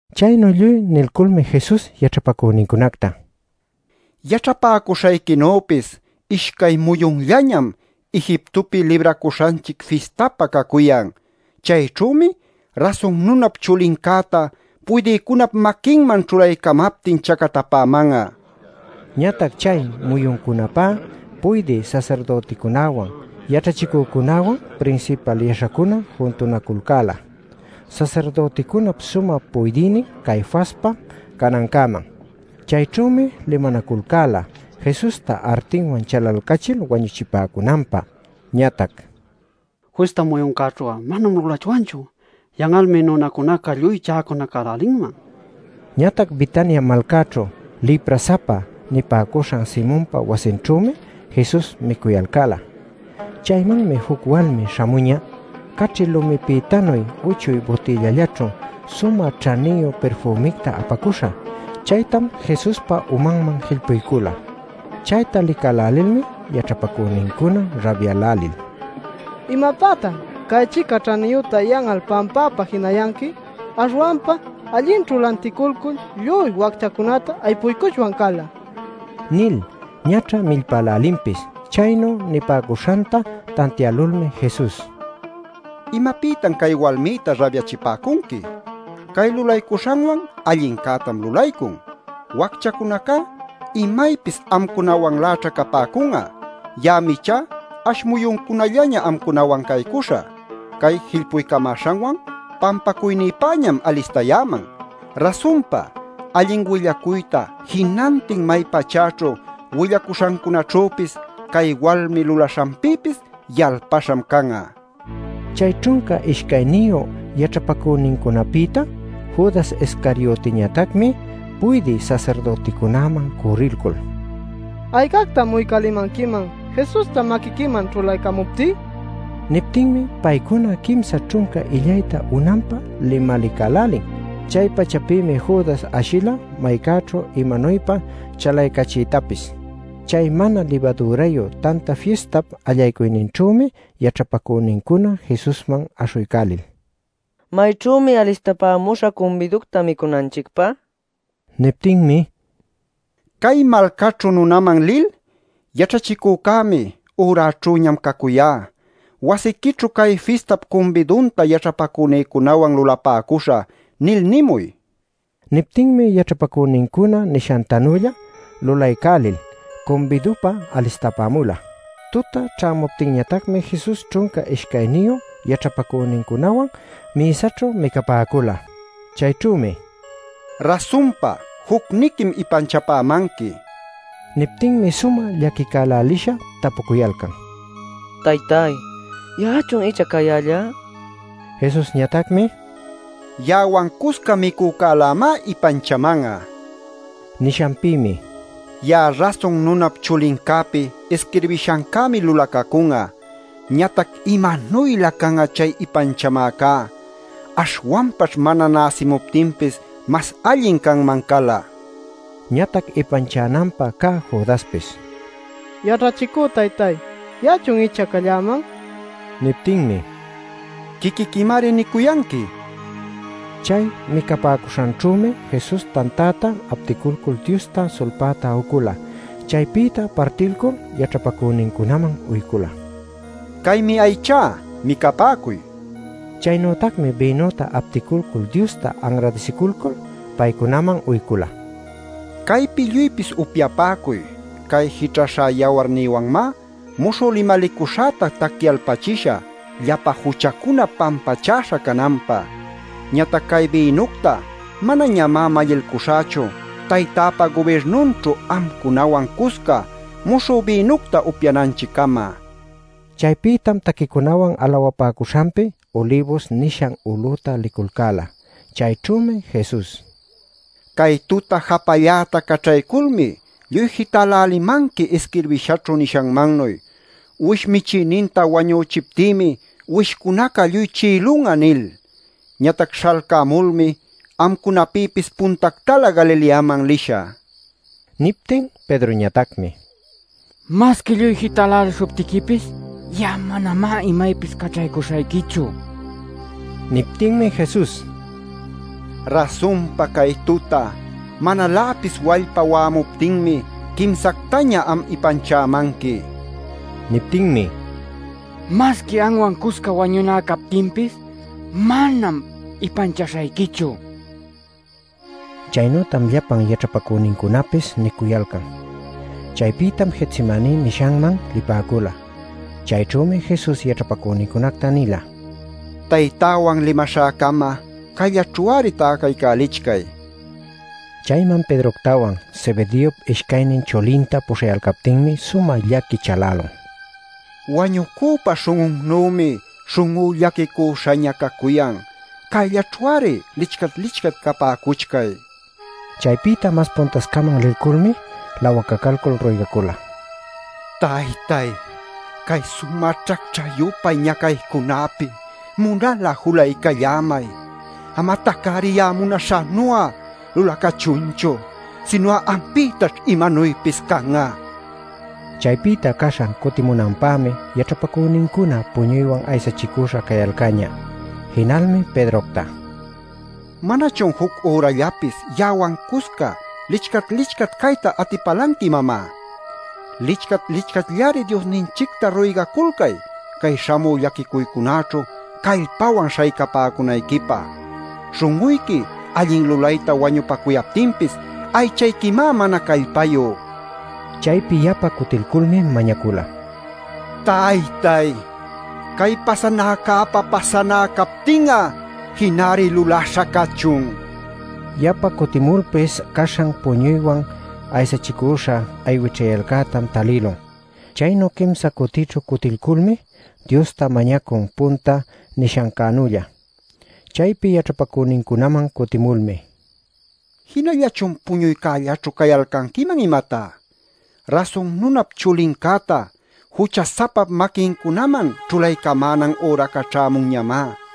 Chaynu lluy nilculmi Jesus yaćhapacünincunacta: “Yaćhapäcuśhayquinüpis ishcay muyunllañam Egiptopi Libracuśhanchic fistapä cacuyan. Chayćhümi Rasun Nunap Chulincäta puydïcunap maquinman ćhulaycamaptin chacatapäman'a” nin. Ñatac chay muyuncunapä puydï sasirdüticunawan, yaćhachicücunawan prinsipal yaśhacuna juntunaculcäla sasirdüticunap sumä puydïnin Caifaspa canancäman. Chayćhümi limanaculcäla Jesusta artiwan chalalcälil wañuchipäcunanpä. Ñatac: “Fista muyuncäćhu'a manam lulachwanchu; yan'almi nunacunaca lluy chäcunacälälinman” ninaculcan. Ñatac Betania malcäćhu “lipra-sapa” nipäcuśhan Simonpa wasinćhümi Jesus micuyalcäla. Chaymanmi juc walmi śhamuñä caćhi lumipïtanuy uchuy butïllachaćhu sumä ćhaniyu pirfümicta apacuśha. Chaytam Jesuspa umanman jillpuycula. Chayta licälälilmi yaćhapacünincuna rabyälälil: “¿Imapätan cay-chica ćhaniyüta yan'al pampapä jinayanqui? Aśhwanpam allinćhu lanticulcul lluy wacchacunacta aypuycuchwan cala” nil ñaćha millpälälinpis. Chaynu nipäcuśhanta tantiälulmi Jesus: “¿Imapïtan cay walmïta rabyachipäcunqui? Cay lulaycuśhanwan allincätam lulaycun. Wacchacunacá imaypis amcunawanläćha capäcun'a. Ya'am ichá ash muyuncunallaña amcunawan caycuśhä. Cay jillpuycamäśhanwan pampacuynïpäñam alistayäman. Rasunpa, allin willacuyta jinantin may pachäćhu willacuśhancunaćhüpis, cay walmi lulaśhanpïpis yalpaśham can'a” nila. Chay ćhunca ishcayniyu yaćhapacünincunapïta Judas Iscariotiñatacmi puydï sasirdüticunäman cürrilcul: “¿Aycactam uycälimanquiman Jesusta maquiquiman ćhulaycamuptí?” nila. Niptinmi paycuna quimsa ćhunca illayta unanpä limalicälälin. Chay-pachapïmi Judas ashila maycäćhu imanuypa chalaycachiytapis. Chay Mana Libadürayu Tanta Fistap allaycuyninćhümi yaćhapacünincuna Jesusman aśhuycälil: “¿Mayćhümi alistapamuśhä cumbiducta micunanchicpä?” nipäcula. Niptinmi: “Cay malcaćhu nunaman lil: ‘Yaćhachicücämi: “Üräćhüñam cacuyá. Wasiquićhu cay fistap cumbidunta yaćhapacünïcunawan lulapäcuśhä” ’ nil nimuy” nila. Niptinmi yaćhapacünincuna nishantanülla lulaycälil cumbidupä alistapämula. Tuta ćhämuptinñatacmi Jesus ćhunca ishcayniyu yaćhapacünincunawan mïsaćhu micapäcula. Chayćhümi: “Rasunpa jucniquim ipanchapämanqui” nin. Niptinmi sumä llaquicälälisha tapucuyalcan: “Taytay, ¿ya'achun icha cayällá?” nil. Jesusñatacmi: “Ya'awan cusca micücälämá ipanchaman'a” nila. Nishanpïmi: “Ya'a Rasun Nunap Chulincäpi isquirbishancämi lulacacun'a. Ñatac ¡imanuylä can'a chay ipanchamäcá! Aśhwanpaćh mana näsimuptinpis mas allin canman cala” nin. Ñatac ipanchananpä cä Judaspis: “Yaćhachicü taytay, ¿ya'achun icha calläman?” nin. Niptinmi: “Quiquiquimari nicuyanqui” nin. Chay micapäcuśhanćhümi Jesus tantäta apticulcul Diosta sulpayta ucula. Chaypïta partilcul yaćhapacünincunaman uycula: “Caymi aychá; micapäcuy” nil. Chaynütacmi bïnüta apticulcul Diosta anradisiculcul, paycunaman uycula: “Caypi lluypis upyapäcuy. Cay jićhaśha yawarnïwanmá muśhü limalicuśhäta tacyalpachishä llapa juchacuna pampachäśha cananpä. Ñatac cay bïnucta manañamá mallilcuśhächu Taytäpa gubirnunćhu amcunawan cusca muśhü bïnucta upyananchiccama” nin. Chaypïtam taquicunawan alawapäcuśhanpi Ulibus nishan ulüta liculcäla. Chayćhümi Jesus: “Cay tuta japalläta caćhayculmi lluy jitälälimanqui isquirbïshaćhu nishanmannuy: ‘Uwish michïninta wañüchiptïmi uwishcunaca lluy chi'ilun'a’ nil. Ñatac śhalcämulmi amcunapïpis puntactalä Galileaman lishä” nila. Niptin Pedroñatacmi: “¡Masqui lluy jitälälishuptiquipis ya'a manamá imaypis caćhaycuśhayquichu!” nicuyan. Niptinmi Jesus: “Rasunpa cay tuta manaläpis wallpa wa'amuptinmi quimsactaña am ipanchämanqui” nin. Niptinmi: “¡Masqui anwan cusca wañuná captinpis manam ipanchaśhayquichu!” nicuyan. Chaynütam llapan yaćhapacünincunapis nicuyalcan. Chaypïtam Getsemaní nishanman lipäcula. Chayćhümi Jesus yaćhapacünincunacta nila: “Taytäwan limaśhäcama cayllaćhu-ari täcaycälichcay” nil. Chayman Pedroctawan, Zebedeop ishcaynin chulinta puśhayaptinmi sumä llaqui chalälun: “Wañucüpä śhun'unnümi śhun'ú llaquicüśhaña cacuyan. Cayllaćhu-ari lichcat-lichcat capäcuchcay” nil. Chaypïta mas puntascaman lilculmi lawacaculcul ruygacula: “Taytay, cay sumä ćhacćhä-yupay ñacaycunäpi munal'a julaycallämay. Amatac-ari ya'a munaśhänu'a lulacächunchu, sinu'a ampïtaćh imanuypis can'a” nil. Chaypïta caśhan cutimunanpämi yaćhapacünincuna puñuywan aysachicüśha cayalcäñä. Jinalmi Pedrocta: “¿Manachun juc ürallapis ya'awan cusca licchat-licchat cayta atipälanqui imamá? Licchat-licchatllari Diosninchicta ruygaculcay cay śhamü llaquicuycunäćhu callpawan śhaycapäcunayquipä. Śhun'uyqui allin lulayta wañupacuyaptinpis aychayquimá mana callpayu” nin. Chaypi yapa cutilculmi mañacula: “Taytay, cay pasanäcäpa pasanä captin'a jinari lulaśha cachun” nil. Yapa cutimulpis caśhan puñuywan aysachicüśha aywićhyayalcätam talïlun. Chaynu quimsa cutićhu cutilculmi Diosta mañacun punta nishancänülla. Chaypi yaćhapacünincunaman cutimulmi: “¿Jinallachun puñuycällaćhu cayalcanquiman, imatá? Rasun Nunap Chulincäta jucha-sapap maquincunaman ćhulaycamänan üraca ćhämunñamá.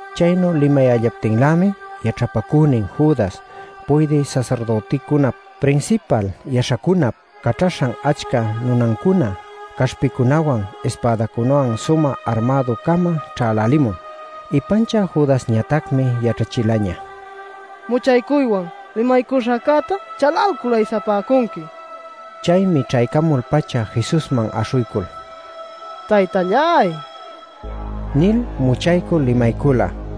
Chaynu limayällaptinlämi yaćhapacünin Judas puydï sasirdüticunap, prinsipal yaśhacunap caćhaśhan achca nunancuna caśhpicunawan, ispädacunawan sumä armädu-cama ćhälälimun. Ipanchä Judasñatacmi yaćhachilaña “Muchaycuywan limaycuśhäcäta chalalcul aysapäcunqui” nil. Chaymi ćhämul-pacha Jesusman aśhuycul: “Taytalláy” nil muchaycul limaycula.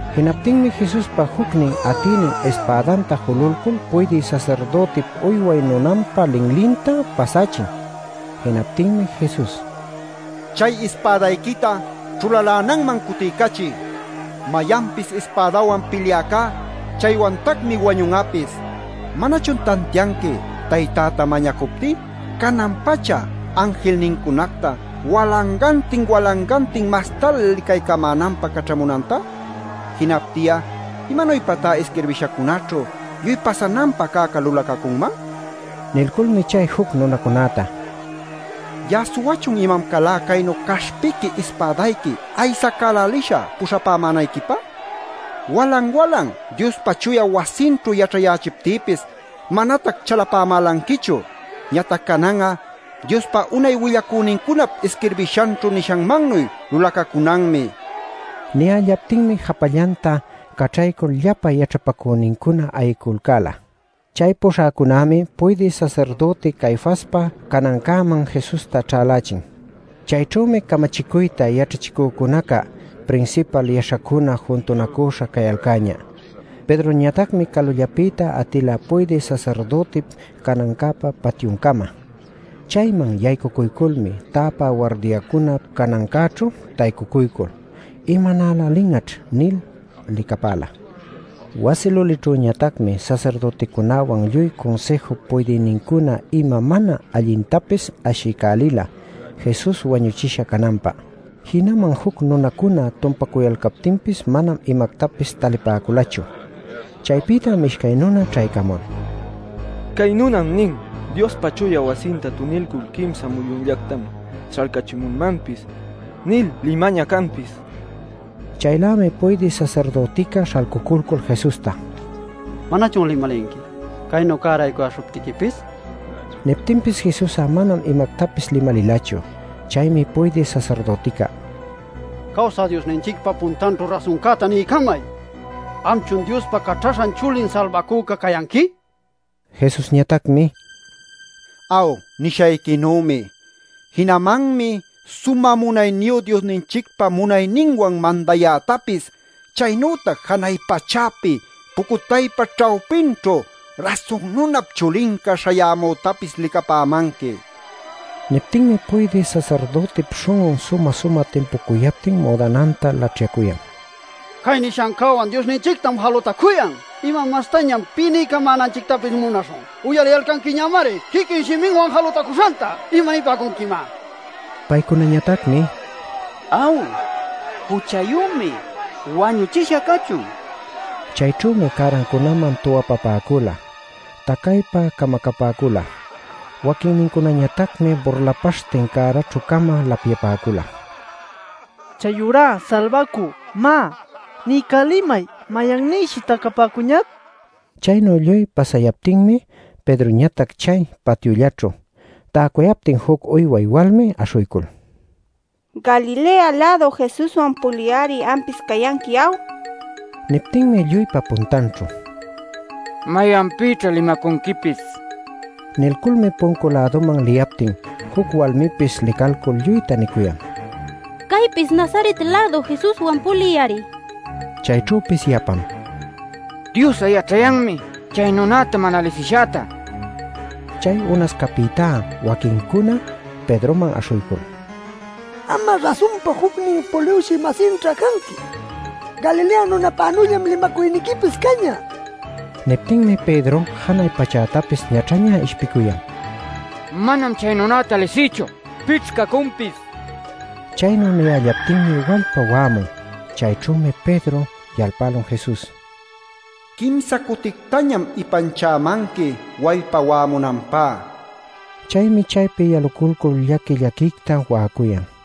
Jinaptinmi Jesuspa jucnin atïnin ispädanta jululcul puydï sasirdütip uyway nunanpa linlinta pasächin. Jinaptinmi Jesus: “Chay ispädayquita ćhulalänanman cutiycachiy. Mayanpis ispädawan pilyäcá chaywantacmi wañun'apis. ¿Manachun tantianqui Taytäta mañacuptí canan-pacha anjilnincunacta walangantin walangantin mastalä licaycamänanpä caćhamunanta? Jinaptin'a, ¿imanuypatá isquirbishacunäćhu lluy pasananpä cäca lulacacunman?” nila. Nilculmi chay juc nunacunäta: “¿Ya'a suwachun imam calá caynu caśhpiqui ispädayqui aysacälälisha puśhapämänayquipä? Walan-walan Diospa chuya wasinćhu yaćhayächiptïpis manatac chalapämälanquichu. Ñatac canan'a Diospa unay willacünincunap isquirbishanćhu nishanmannuy lulacacunanmi” nila. Niyällaptinmi japallanta caćhaycul llapa yaćhapacünincuna ayiculcäla. Chay puśhäcunämi puydï sasirdüti Caifaspa canancäman Jesusta ćhälächin. Chayćhümi camachicuyta yaćhachicücunaca, prinsipal yaśhacuna juntunacüśha cayalcäñä. Pedroñatacmi calullapi atila puydï sasirdütip canancäpa patyuncama. Chayman yaycucuyculmi täpä wardiacuna canancäćhu taycucuycul “¿Imanälälin'aćh?” nil licapäla. Wasi lulićhüñatacmi sasirdüticunäwan lluy Cunsïjup puydïnincuna ima mana allintapis ashiycälila Jesus wañuchisha cananpä. Jinaman juc nunacuna tumpacuyalcaptinpis manam imactapis talipäculachu. Chaypïtam ishcay nuna ćhaycamul: “Cay nunam nin ‘Diospa chuya wasinta tunilcul quimsa muyunllactam śhalcächimümanpis’ nil limañä canpis” nipäcun. Chaylämi puydï sasirdütica śhalcuculcul Jesusta: “¿Manachun limalinqui, caynu cäraycuyäśhuptiquipis?” nin. Niptinpis Jesus'a manam imactapis limalilachu. Chaymi puydï sasirdütica: “Cawsä Diosninchicpa puntanćhu rasuncäta niycamay. ¿Amchun Diospa Caćhaśhan Chulin Salbacüca cayanqui?” nin. Jesusñatacmi: “Aw, nishayquinümi. Jinamanmi Sumä Munayniyu Diosninchicpa munayninwan mandayätapis, chaynütac janay pachäpi pucutaypa ćhawpinćhu Rasun Nunap Chulinca śhayämütapis licapämanqui” nin. Niptinmi puydï sasirdütip śhun'un sumä-sumä timpucuyaptin müdananta laćhyacuyan: “¡Cay nishancäwan Diosninchictam jalutacuyan! ¿Ima mastañam pï niycamänanchictapis munaśhun? Uyaliyalcanquiñamari quiquin shiminwan jalutacuśhanta. ¿Imanipäcunquimá?” nil. Paycunañatacmi: “Aw, juchayümi. Wañuchisha cachun” nil nipäcun. Chayćhümi cärancunaman tuwapapäcula, tacaypa camacapäcula. Waquinnincunañatacmi burlapaśhtin cäraćhü-cama lapyapäcula: “Chayurá Salbacü, má, niycälimay, mayannïshi tacapäcuñac” nil. Chaynu lluy pasayaptinmi Pedroñatac chay patyullaćhu täcuyaptin juc uyway walmi aśhuycul: “Galilea-lädu Jesuswan pulï-ari ampis cayanqui ¿aw?” nin. Niptinmi lluypa puntanćhu: “¿Mayanpïćha limacunquipis?” nin. Nilculmi puncu-läduman liyaptin juc walmipis licalcul lluyta nicuyan: “Caypis Nazaret-lädu Jesuswan pulï-ari” nil. Chayćhüpis yapam: “¡Dios'a yaćhayanmi chay nunäta mana lisishäta!” nil nicuyan. Chay unascapïtá waquincuna Pedroman aśhuycul: “Am'a rasunpa jucnin puliwshï-masinćha canqui. Galilea nunäpanüllam limacuyniquipis cañä” nicuyalcan. Niptinmi Pedro janay pachätapis ñaćhaña ishpicuyan: “¡Manam chay nunacta lisïchu! ¿Pićh cacunpis?” nil. Chaynu niyällaptinmi wallpa wa'amun. Chayćhümi Pedro yalpälun Jesus: “Quimsa cutictañam ipanchämanqui wallpa wa'amunanpá” nil nishanta. Chaymi chaypi yalulcul llaqui-llaquicta wa'acuyan.